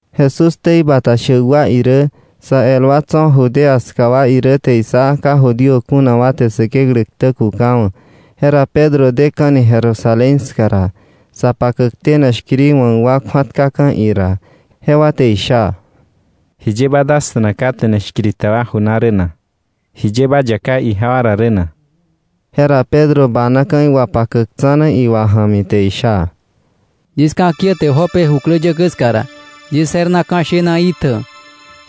Jesús ktei bata shäk wa irä, sa el wa tso̱ Judea ska wa irä te issa ka Judío kuna wa te Säkeklä ktä kukawa̱. Jera Pedro deka̱ni Jerusalén ska ra, sa pakäk tene shkiri wa̱k wa kju̱atkaka̱ ira, jewa te isha: —¿Jiye ba dasta̱na ka tene shkiri ta wa ju na rä na? ¿Jiye ba yaká ijewa ra rä na? Jera Pedro banaka̱ iwapakäk tsa̱na iwa ja̱mi, te isha: —Yis ka̱kiäte Jope jukläyäkäí ska ra, yis je̱r na ka̱ shena itjä,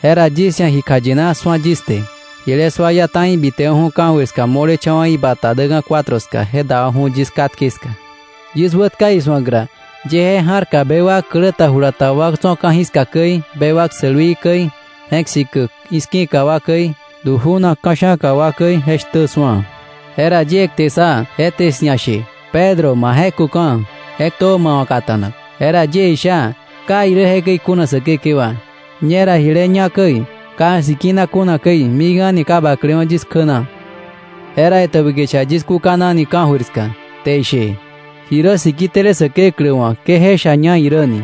jera yis ia̱ ji kjayina su̱a yis te. Jile sua iá ta̱i bitewa̱ ka̱jöir ska mo̱lecha̱wa̱ ibata däka̱ cuatro ska, je dewa̱ju̱ yis katke ska. Yis wätka isu̱ak ra, yie je ja̱rka bewak klä ta jula ta wa tso̱ ka̱jiska käi, bewak sälwii käi, je̱k sikäk i̱ski̱ka wa käi, du ju̱nak ka̱sha̱ka wa käi je shtä su̱a. Jera yie kte ssa, je te 'sia̱ ishe: ‘Pedro, ma je̱köka̱, je ktö ma wa̱ kata̱nak.’ Jera yie isha: ‘¡Ka irä jekäi kuna Säkekewa! Ñera jile ñá käi, ka sikina kuna käi, mik a̱ni ka baklewa̱ yis kjä na.’ Jera etäbä kicha yis kúkanani ka̱jöir ska, te ishe: ‘Ji rä siki tele Säkeklä wa̱ ke je sha ña irä ni.’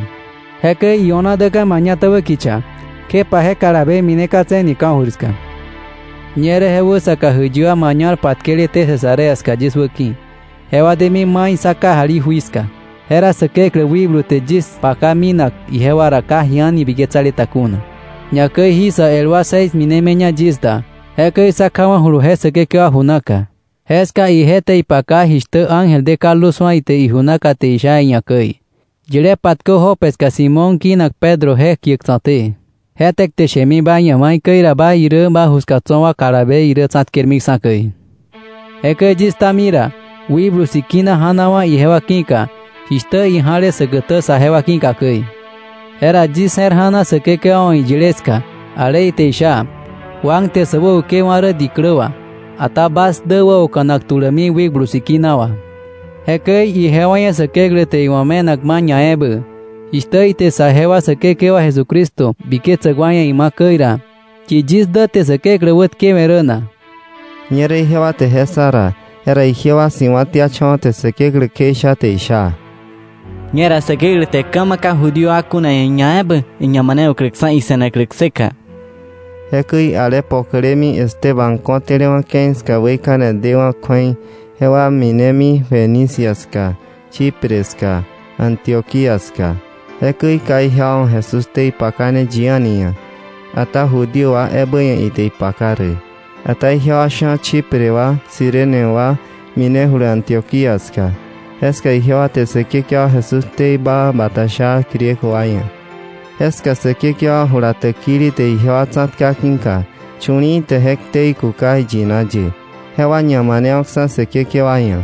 Jekäi io̱na deka̱ mañatäbä kicha, kjepa je kalabe mineka̱tse̱ni ka̱jöir ska. Ñerä je wäsaka jäiyi wa mañal patkeleté Cesarea ska yis wäki̱, jewa demi mai sá kajali jui ska. Jera Säkeklä wikblu te yis paka minak ijewa ra ka ji a̱ni biketsale ta kuna. Ñakäi jí sä el wa seis minemiña yis da, jekäi sá kjawa̱julu je säkekewa ju naka. Jeska ije te ipaka jishtä ángel de kaldu su̱a ite iju naka te isha iia̱ käi: ‘Yile patkö Jope ska Simón kinak Pedro je kiäk tsa̱té. Je te kte shemi ba ia̱ maikäi ra ba irä ba ju ska tso̱ wa kalabe irä tsa̱tkermiksa̱ käi.’ Jekäi yis ktami ra, Wikblu Sikina ja̱nawa̱ ijewa ki̱ka, jishtä ija̱le säkätä saje wa ki̱ka käi. Jera yis je̱r ja̱na Säkekewa wa̱ iyile ska, ale ite isha: ‘Juan te sä wäukewa̱ rä diklä wà, ata bas dä wäoka̱nak tulämi Wikblu Sikina wà.’ Jekäi ijewa ia̱ Säkeklä te iwa̱ me̱nak ma̱ ñaebä, jishtä ite saje wa Säkekewa Jesucristo biketsäk wa ia̱ ima̱ käi ra, ¿yi yis dä te Säkeklä wätkewe̱ rä na? Ñerä ijewa te je ssa ra, jera ijewa si̱wa̱tiacha̱wa̱ te Säkeklä kjeisha, te isha: —¡Ñera Säkeklä te ka̱ ma̱ ka Judío kuna wa ia̱ ñaebä iñamanewa̱kläksa̱ ise̱naklä kseka! Jekäi ale pokolemi Esteban ko̱tälewa̱ ke̱i ska weikane dewa̱ kju̱ei jewa minemi Fenicia ska, Chipre ska, Antioquía ska. Jekäi ka ijewa wa̱ Jesús ktei pakane yi a̱ni ia̱, ata Judío wa ebä ia̱ ite ipaka rä. Ata ijewa sha̱ Chipre wa, Cirene wa minejulu Antioquía ska. Jeska ijewa te Säkekewa Jesús ktei baa bata sha Griego wa ia̱. Jeska Säkekewa jula täkili te ijewa tsa̱tka ki̱ka chu̱li̱i̱ te je ktei kuka iyina ye, jewa ñamanewa̱ksa̱ Säkekewa ia̱.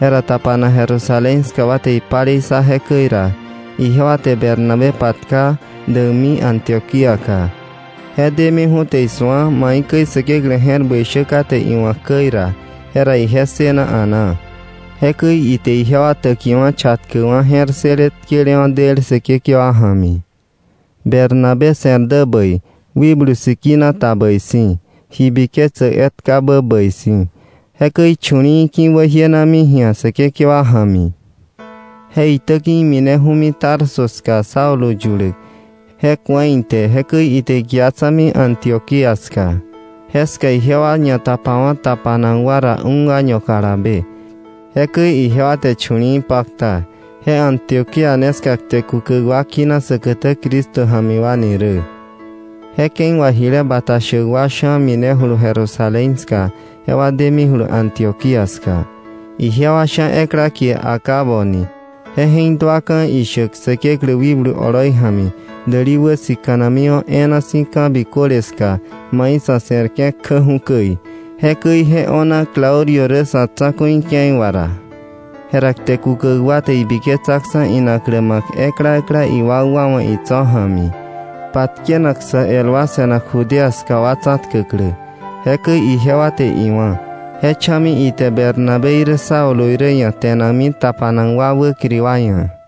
Jera tapanak Jerusalén ska wa te ipalei ssa jekäi ra, ijewa te Bernabé patka däkmi Antioquíaka. Je demiju̱ te isu̱a maikäi Säkeklä je̱r bäi shä kate iwa̱k käi ra, jera ije ssëna a̱naa. Jekäi ite ijewa täkiwa̱ chatkäkwa̱ je̱r ssële tkelewa̱ del Säkekewa ja̱mi. Bernabé se̱r dä bäi, Wikblu Sikina ta bäi si̱, ji biketsäk etkabä bäi si̱. Jekäi chu̱li̱i̱ ki̱wäjienami ji̱a Säkekewa ja̱mi. Je itäki̱ imineju̱mi Tarso ska Saulo yuläk. Je ku̱a ite, jekäi ite ikia tsa̱mi Antioquía ska. Jeska ijewa ñatapawa̱ tapanak wa ra un año kalabe. Jekäi ijewa te chu̱li̱i̱ pakta. Je Antioquía ne ska kte kukäk wa kina säkätä “Cristo ja̱mi wa” ni rä. Je ke̱i wà jile bata shäk wa sha̱ minejulu Jerusalén ska jewa demijulu Antioquía ska. Ijewa sha̱ ekla kie Agabo ni, je je̱k duaka̱ ishäk Säkeklä wikblu oloi ja̱mi däli wäsika̱namiwa̱ e̱e̱na si̱ ka̱ biköle ska mai sa̱ se̱rke̱ kjäju̱ käi. Jekäi je o̱na Claudio rä sa̱ tsa̱ku̱i ke̱i wà ra. Jera kte kukäk wa te ibiketsaksa̱ inaklä ma̱k ekla ekla iwakwa wa̱ itso̱ ja̱mi, patkenak sä el wa se̱nak Judea ska wa tsa̱tkäklä. Jekäi ijewa te iwá̱. Je cha̱mi ite Bernabé irä Saulo irä ia̱ te̱nakmi tapanak wa wäkiri wa ia̱.